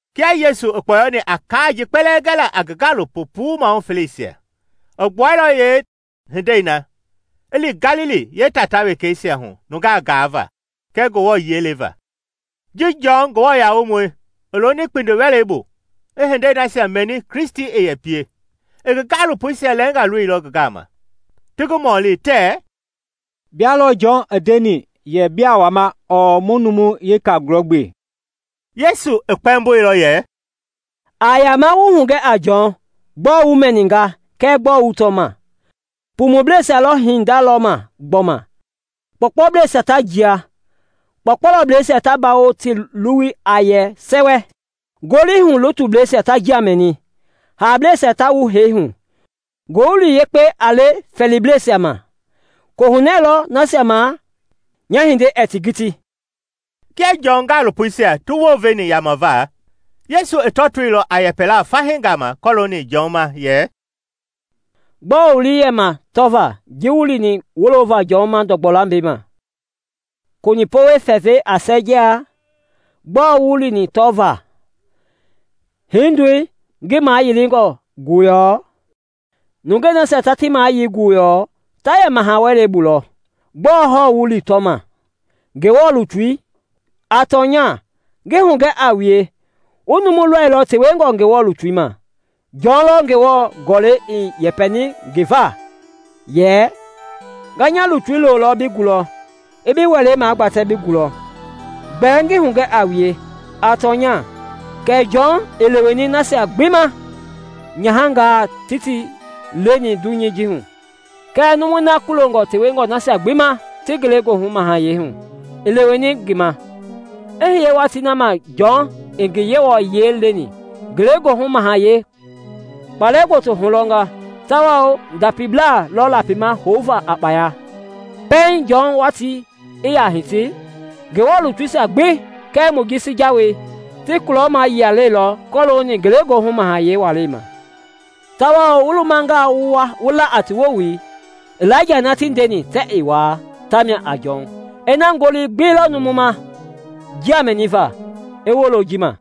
Kia Yesu i kpɔyɔni a kaa ji kpɛlɛɛ gɛla a ngi gaalopo puu maahu felesia i gbuailɔ yeehindei na i li Galili yeetaa wekeisia hu nunga gaava kɛɛ Ngewɔ yiɛi leva. Ji Jɔn Nguamɔi i loni kpindiwelɛi bu i hindei nasia mɛni Kristi i yɛ pie, i ngi gaalopoisia lɛɛnga loilɔ ngi gama. Ti ngi mɔlilɔ tɛɛ, “Bia lɔ Jɔn i ndeni yɛ biaa wama ɔɔ mu numu weka gulɔgbe?” Yesu i kpɛmboilɔ yɛ, “A yaama wu hugɛ a Jɔn gbɔɔ wu mɛnima kɛɛ na wu tɔma: pumublɛisia lɔ hinda lɔma gbɔma, kpɔɔkpɔblɛisia ta jia, kpɔukpɔublɛisia ta bawo ti luwui a yɛ sɛwɛ, ngolihu-lutublɛisia ta njia mɛni, haableisia ta wu hee hu, Ngowili Yekpei a le fɛɛliblɛisia ma. Kohunɛ lɔ nasia ma nya hinda ɛɛ ti kiti!” Kia Jɔn gaalopoisia ti wounveni yamava, Yesu i tɔtoilɔ a yɛpɛla fahii gama kɔlooni Jɔn ma yɛ, “Gbɔɔ wu lii i yɛ ma tɔva ji wu lini wolova Jɔn ma ndɔgbɔ lambɛi ma? Konipɔwɛi fɛfɛi a sɛɛjia? Gbɔɔ wu lini tɔvaa? Hindoi ngi mayilingɔ guyɔɔ? Nungei nasia ta ti mayili guyɔɔ ta yɛ maha wɛleisia bu lɔ. Gbɔɔ hɔɔ wu lini tɔma? Ngewɔ lutui? A tɔnya, ngi hugɛ a wue, wu numu lɔilɔ tewengɔ Ngewɔ lutu ma. Jɔn lɔ Ngewɔ Gɔlɛi i yɛpɛni ngi va yɛ, ‘Nga nya lutui lolɔ bi gulɔ i bi welei gbatɛ bi gulɔ.’ Gbɛɛ ngi hugɛ a wue, a tɔnya, kɛ Jɔn i leweni nasia gbi ma nyahangaa ti ti leni dunyei ji hu, kɛɛ numui na kulongɔ tewengɔ nasia gbi ma ti Ngelegoohu Mahayɛi hu i leweni ngi ma. I hiye watii na ma Jɔn i ngi Yewɔ yiɛi leni, Ngelegoohu Mahayɛi kpalɛ gboto hulɔnga tawao ndapiblaa lɔ lapima houva a kpaya. Pɛiŋ Jɔn watii i yaa hiti, Ngewɔ lutuisia gbi kɛɛ Mojisi Jawei ti kulɔmayia leilɔ kɔlooni Ngelegoohu Mahayɛi walei ma; tawao wu lumangaa wu la a ti wowili, Ilaija na ti ndeni tɛɛ a wa, tamia a Jɔn. Ina ngoli gbi lɔ numu ma njia mɛniva, i wolo ji ma.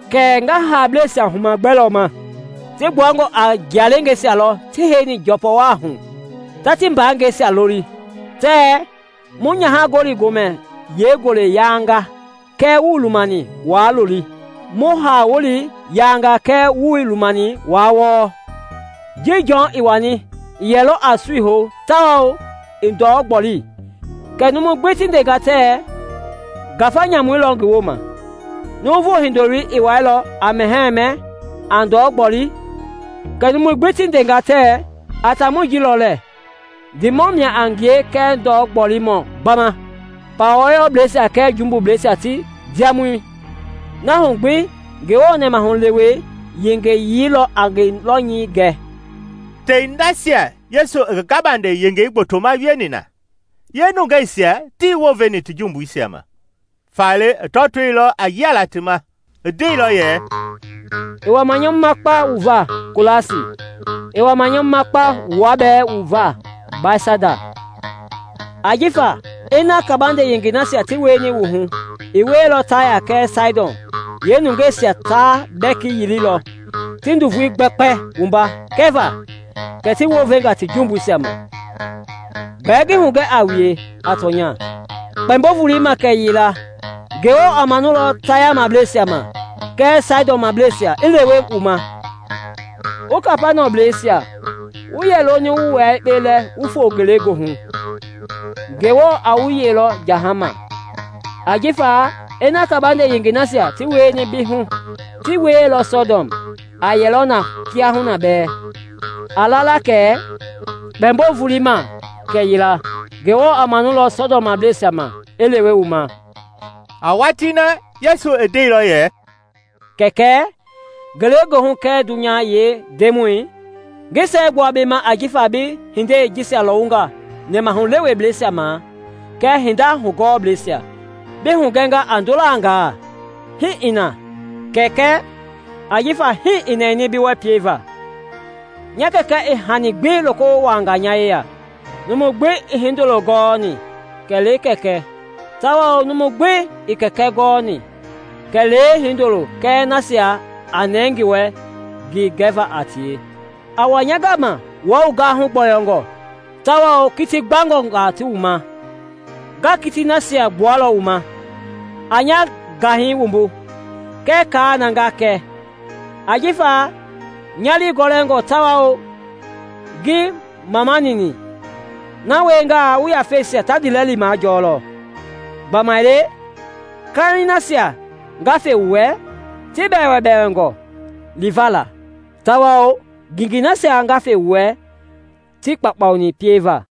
“Kɛɛ nga haableisia huma gbɛ lɔ ma? Ti gbuangɔ a jialeengeisia lɔ ti heini njɔpɔwaahu ta ti mbaangɛisia loli tɛɛ ‘Mu nyaha-gɔli-gomɛi yee ngulei yaanga kɛɛ wuii lumani waa looli; mu haa-wuleisia yaanga kɛɛ wuii lumani waa wɔɔ.’ Ji Jɔn i wani, i yɛlɔ a sui hou tawao ɛɛ ndɔ gboli, kɛ numui gbi ti ndea tɛɛ, ‘Ngafa nyamui lɔ ngi woma’; Nuuvu Hindoloi i wɛilɔ, a mɛhɛɛ mɛ a ndɔ gboli, kɛ numui gbi ti ndea tɛɛ, ‘A taamɔi ji lɔ lɛɛ! Ndiimɔ mia a ngie kɛɛ ndɔ gbolimɔ gbama, pawa wɔyɔblɛisia kɛɛ jumbubleisia ti ndiamɔi!’ Na hu gbi Ngewɔ nɛmahulewei yengeyii lɔ a ngi lɔnyayii gɛ.” Tei nasia Yesu i ngi gabande yengei gbotoma wieni na, yeenungeisia tii wounveni ti jumbuisia ma, faale i tɔtoilɔ a yialaa ti ma. I ndeilɔ yɛ, “I wama nyamuma kpa wu va Kolasi! I wama nyamuma kpa wua bɛɛ va Bɛtsaida! Ajifa ina kabande yengei nasia ti wieni wu hu i wieilɔ Taya kɛɛ Saidɔn, yeenungeisia taa bɛki yililɔ, ti nduvui gbɛkpɛi wumba kɛva kɛ ti wounvenga ti jumbuisia ma. Gbɛɛ ngi hugɛ a wue a tɔnya, kpɛmbo-volei ma kɛyila, Ngewɔ a manulɔ Tayablɛisia ma kɛɛ Saidɔnblɛisia i lewe wu ma. Wu Kapaniɔmblɛisia! Wu yɛ loni wu wua yekpe lɛ wu fo Ngelegoohu. Ngewɔ a wu yeilɔ jahama. Ajifa ina kabande yengei nasia ti wieni bi hu ti wieilɔ Sɔdɔm, aa yɛlɔ na kiahuna bɛɛ. A la la kɛ kpɛmbo-volei ma kɛyila, Ngewɔ a manulɔ Sɔdɔmblɛisia ma i lewe wu ma.” A watii na Yesu i ndeilɔ yɛ, “Kɛkɛ, ngelegoohu kɛɛ dunya yee Ndemɔi, ngi siɛgbua bi ma ajifa bi hindei jisia lɔwunga nɛmahulewebleisia ma kɛɛ hinda hugɔɔ blɛisia bi hugɛnga a ndolangaa. Hii i na, Kɛkɛ, ajifa hii i nɛni bi wɛ pieva. “Nya Kɛkɛ i hani gbi loko wuaanga nya yeya. Numu gbi ii Hindoloi gɔɔ kɛlee Kɛkɛi tawao numu gbi ii Kɛkɛi gɔɔ kɛlee Hindoloi kɛɛ nasia a nɛɛ ngi wɛ ngi gɛva a tie. “A wa nya gama wua wu gahu gbɔyɔngɔ tawao kiti gbangɔngaa ti wu ma, nga yeekitiisia gbualɔ wu ma. A nya gaiŋ wumbu kɛɛ kaa na nga kɛ; ajifa nya lii gɔlɛngɔ tawao ngii mamanini, na wiengaa wu yafeisia ta ndiilɛli majɔlɔ. Gbamaile kaiŋ nasia nga fe wu wɛ ti bɛɛbɛɛngɔ li va la; tawao ngengei nasia nga fe wu wɛ tii kpaukpauni pieva.”